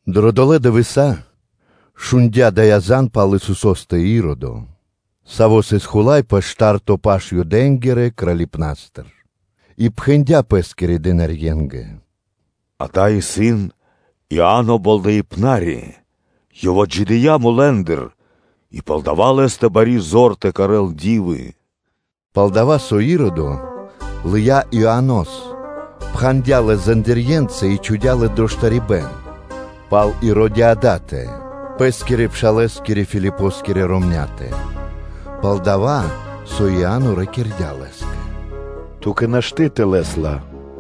Дро долэ́ дывэса́ шундя́ дая́ зан (звесь) пал Исусо́стэ Иродо, саво́ сыс хула́й пэ шта́рто паш Юдэ́нгирэ Кралипнастыр, и пхэндя́ пэ́скирэ дынарье́нгэ: “Дава́ исын Иа́но Болдэипнари; ёв отджидыя́ мулэ́ндыр, и палдава́ лэ́стэ бари зор тэ кэрэ́л ди́вы.” Пал-дова́ со Иродо лыя́ Иоанос, пхандя лэс зандирьенца и чхудя́ лэс дро штарибэ́н пал Иродиадатэ, пэ́скирэ пшалэ́скирэ Филипоскирэ ромня́тэ, пал-дова́ со Иа́но ракирдя́ лэ́скэ: “Ту́кэ нашты́ тэ лэс ла.”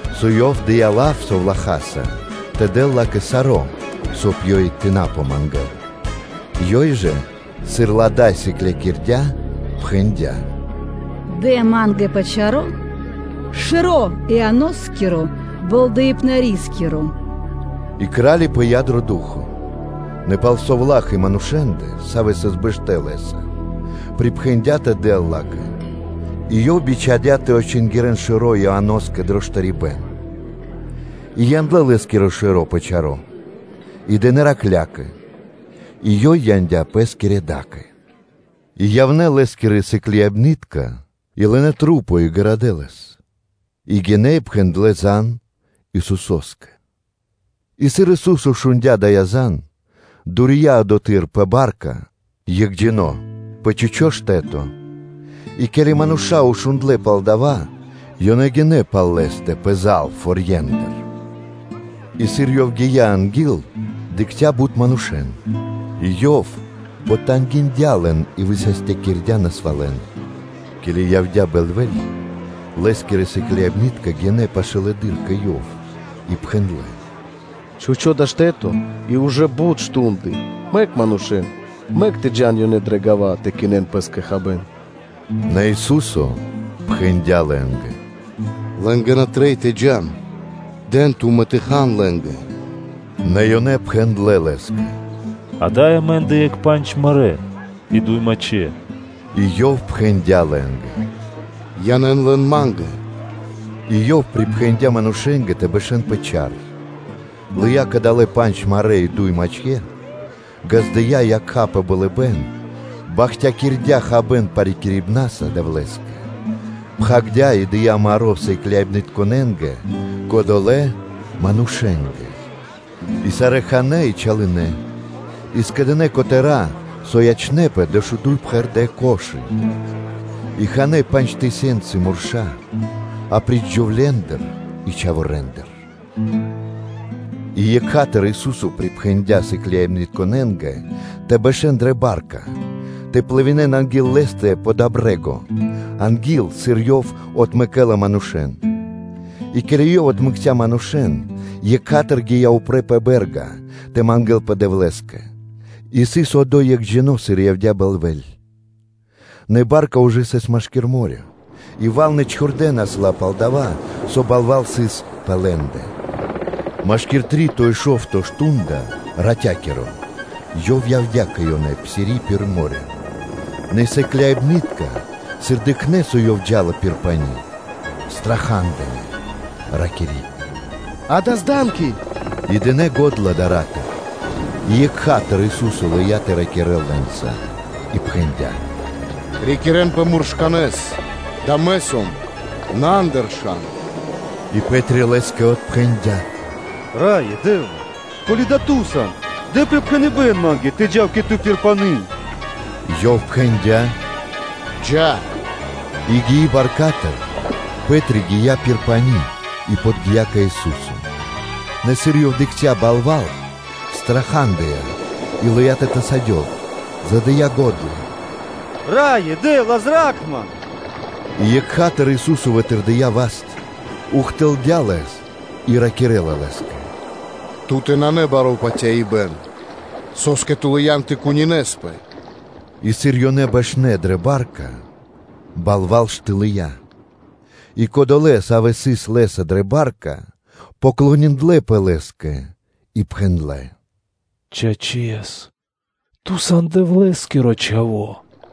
со ёв дыя́ лав совлахаса тэ дэл ла́кэ саро́, соб (кай) ёй тэ на помангэл. Ёй жа, сыр ла дай сыклякирдя́, пхэндя́: “Дэ ма́нгэ пэ чаро́ шэро́ Ианоскиро Болдэипнарискиро.” И кра́ли пыя́ дро ду́хо (фа́но), нэ пал совла́х и манушэ́ндэ, савэ́ сыс бэштэ́ лэ́са, припхэндя́ тэ дэл ла́кэ, и ёв бичхадя́ тэ отчингирэн шэро́ Ианоскэ дро штарибэ́н, и яндлэ́ лэ́скиро шэро́ пэ чаро́ и дынэ́ раклякэ, и ёй яндя́ пэ́скирэ да́кэ. И явнэ́ лэ́скирэ сыкляибны́тка и лынэ́ тру́по и гарадэ́ лэс; и гинэ́ и пхэндлэ́ зан (звесь) Исусо́скэ. И сыр Ису́со шундя́ дая́ зан, то дурия одотхы́р пэ ба́рка екхджино́ пэ чхучо́ штэ́то; и ке́ли мануша́ шундлэ́ пал дава́, ёнэ гинэ́ пал Лэ́стэ пэзал форье́ндыр. И сыр Ёв гия́ анги́л, дыкхця́ бут манушэ́н; и Ёв потангиндя лэн и высастякирдя́ насвалэн. Ке́ли явдя́ бэльвэ́ль, ёнэ гинэ́ пашылэды́р кэ Ёв; и Лэ́скирэ сыкляибны́тка пхэндлэ́: “Чхучо́ (пусто) дава́ исын штэ́то и ужэ бут мардэ́, мэк манушэ́н, мэк тэ джа́н ёнэ дрэ гава́ тэ кинэн пэ́скэ хабэ́н.” Нэ Ису́со пхэндя́ лэ́нгэ: “Лэ́нгэ на трэй тэ джа́н: дэн тумэ́ тэ хан лэ́нгэ.” Нэ ёнэ пхэндлэ́ Лэ́скэ: “Ада́й амэ́ндэ исын екх пандж марэ́ и дуй мачхэ́.” И Ёв пхэндя́ лэ́нгэ: “Янэ́н лэн Ма́нгэ.” и Ёв припхэндя́ манушэ́нгэ тэ бэшэ́н пэ чар, лыя́ кадалэ́ пандж марэ́ и дуй мачхэ́, ґаздыя́ якха́ пэ болыбэ́н, бахтякирдя́ хабэ́н парикирибнаса Дэвлэ́скэ, пхагирдя́, и дыя́ маро́ сыкляибнытконэ́нгэ, кодолэ́ ж манушэ́нгэ. И сарэ́ ханэ́ и чалынэ, и скэдынэ́ котэра́, со ячнэ́пэ, дэшуду́й пхэрдэ́ корзи́ны (кхудэ́) И ханэ́ пандж тысёнцы мурша́, апри́ч джувлендэ и чхаворэндэ. И екха́тыр Ису́со зачхудя сыкляибнытконэ́н тэ бэшэ́н дрэ ба́рка тэ плывинэн (тэ дэн плима) анги́л Лэ́стэ пэ дова́ брэ́го, анги́л сыр Ёв отмэкэ́ла манушэ́н. И ке́ли Ёв отмэкця́ манушэ́н, екха́тыр Ёв гия́ упрэ́ пэ бэ́рга тэ мангэ́лпэ Дэвлэ́скэ. И сыс одо́й екхджино́, сыр явдя́ бэльвэ́ль. Нэ ба́рка ужэ сыс машки́р мо́рё (дэрья́в), и валны (вэлны) чхурдэнас ла, пал-дова́ со балва́л сыс пэ лэ́ндэ. Машкир три́то и шо́вто мардо́ (шту́нда) ратя́киро, пэ шта́рто стрэ́га Ёв явдя́ кэ ёнэ, псири пир мо́рё (дэрья́в). Нэ сыкляибны́тка, сыр дыкхнэ́, со Ёв джа́ла пир пани́, страха́дынэ, ракири́: “Дава́ исын зданки (дыкхибэна).” И дынэ́ го́дла дара́тыр. И екха́тыр Ису́со лыя́ тэ ракирэ́л лэ́нца и пхэндя́: “Рикирэнпэ муршканэ́с, дава́ Мэ сом, на андыршан.” И Пэ́три Лэ́скэ отпхэндя́: “Раё Дэ́вла! Ко́ли дава́ Ту сан, дэ припхэныбэ́н ма́нгэ тэ джав кэ Ту пир пани́” Ёв пхэндля: “Джа́!” И гии баркатыр, Пэ́три гия́ пир пани́ и подги́я кэ Ису́со. Нэ сыр ёв дыкхця́ балва́л, страхадыя, и лыя́ тэ тасадёл, задыя го́дла: “Раё Дэ́вла! Зра́кх ман!” И екха́тыр Ису́со вытырдыя васт, ухтылдя пал лэ́стэ, и ракирэ́ла лэ́скэ: “Ту́тэ нанэ баро́ патяибэ́н, со́скэ ту лыян тэ кунинэспэ?” И сыр ёнэ бэшнэ́ дрэ ба́рка, балва́л штылыя. И кодолэ́, савэ́ сыс Лэ́са дрэ ба́рка, поклониндлэпэ Лэ́скэ и пхэндлэ́: “Чачэс, Ту сан Дэвлэ́скиро Чхаво́.”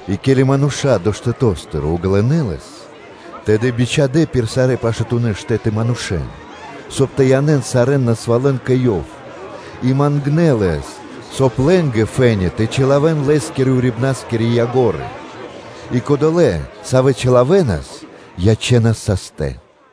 И ке́ли мануша́ долэ́ штэто́стыр ґалынэ́ Лэс, тэды бичхадэ́ пир сарэ́ пашатунэ́ штэ́ты манушэ́н, соб (кай) тэ янэ́н сарэ́н насвалэн кэ Ёв, и мангнэ́ Лэс, соб (кай) лэ́нгэ фэ́ни (то́ка) тэ чилавэн Лэ́скирэ урибнаскирэ яго́ры (краи́), и кодолэ́, савэ́ чилавэнас, ячэнас састэ.